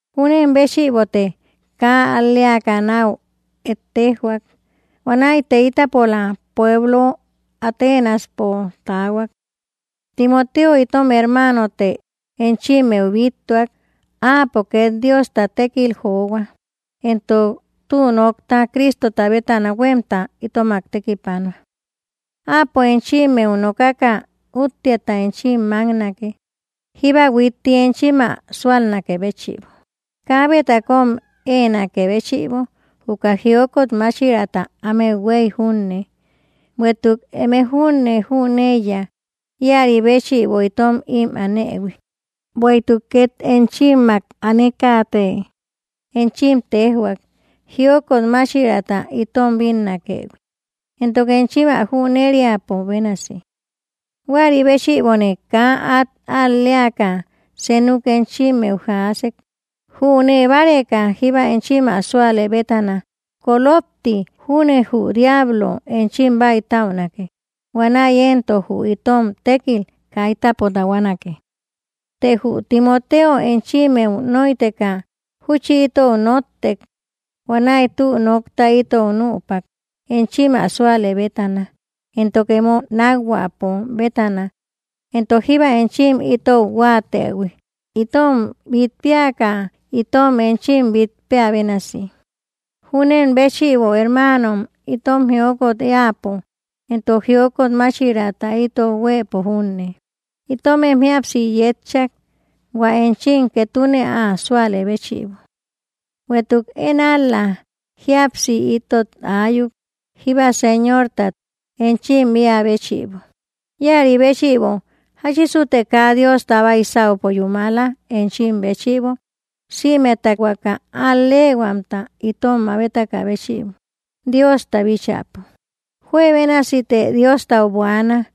Júnen béchïbote kaa al‑leaka náu ettejoak. Huanäite ítapola pueblo Atenaspo taahuak. Timoteo itom hermaanote enchimmeu bíttuak. Áapo két Diosta tékil johua, entok tü nokta Cristota bétana huémta itomak tekipanua. Áapo enchimmeu nokaka útteata enchim máknake, jíba huitti enchim ä súalnakë béchïbo, kaabeta kóm éenakë béchïbo juka jiokot máchiraata ámeu huéy junne. Bueïtuk eme júne jüneiya íäri béchïbo itom ím anëhui. Bueïtuk ket enchimmak anekate enchim téjhuak, jiokot máchiraata itom bínnakëhui, entok enchim ä jüneriapo bénasi. Huäri béchïbone kaa át al‑leaka senuk enchimmeu jaasek, jünee báreka jíba enchim ä súalë bétana, kolopti júne jü diablo enchim bäitäunake. Huanäi éntok jü itom tékkil kaitäpo tahuanake. Të jü Timoteo enchimmeu nóiteka júchi itou nóttek. Huanäi tü nokta itou nüpak enchim ä súalë bétana, entok emo nákhuäpo bétana, entok jíba enchim itou huáatëhui itom bít péaka, itom enchim bít péä bénasi. Júnen béchïbo, hermaanom, itom jiokot éäpo, entok jiokot máchiraata itou huëpo junne, itomem jíapsi yétchak, hua enchim ketune ä súalë béchïbo. Bueïtuk én ál‑la jíapsi itot aayuk, jíba Señortat enchim éä béchïbo. Íäri béchïbo, ¿jáchisute kaa Diosta baisaupo yúmala enchim béchïbo, sïmeta huaka al‑leehuamta itom mabetakä béchïbo Diosta bíchäpo? Juebénasite Diostau buaana,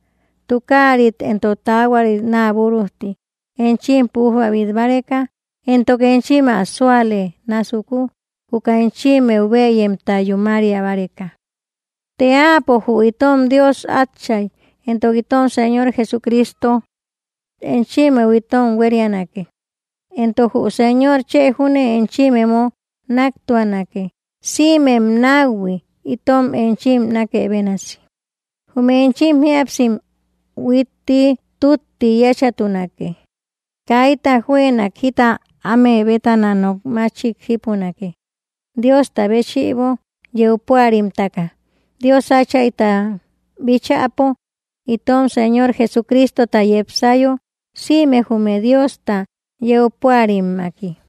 tukaarit entok taahuarit naa búrujti enchim pújba bit báreka, entok enchim ä súalë násuku, juka enchimmeu bëyemta yúmaria báreka. Të Áapo jü itom Dios Átchay, entok itom Señor Jesucristo, enchimmeu itom huérianake. Entok jü Señor chë júne enchim emo náktuanake, sïmem náuhui itom enchim nákë bénasi. Jume enchim jíapsim huitti tútti yéchatunake; kaita juënak jita áme bétana nok máchik jípunake, Diosta béchïbo yeu púarimtaka, Dios Áchayta bíchäpo, itom Señor Jesucristota yepsayo sïme jume Diosta yeu púarimmaki.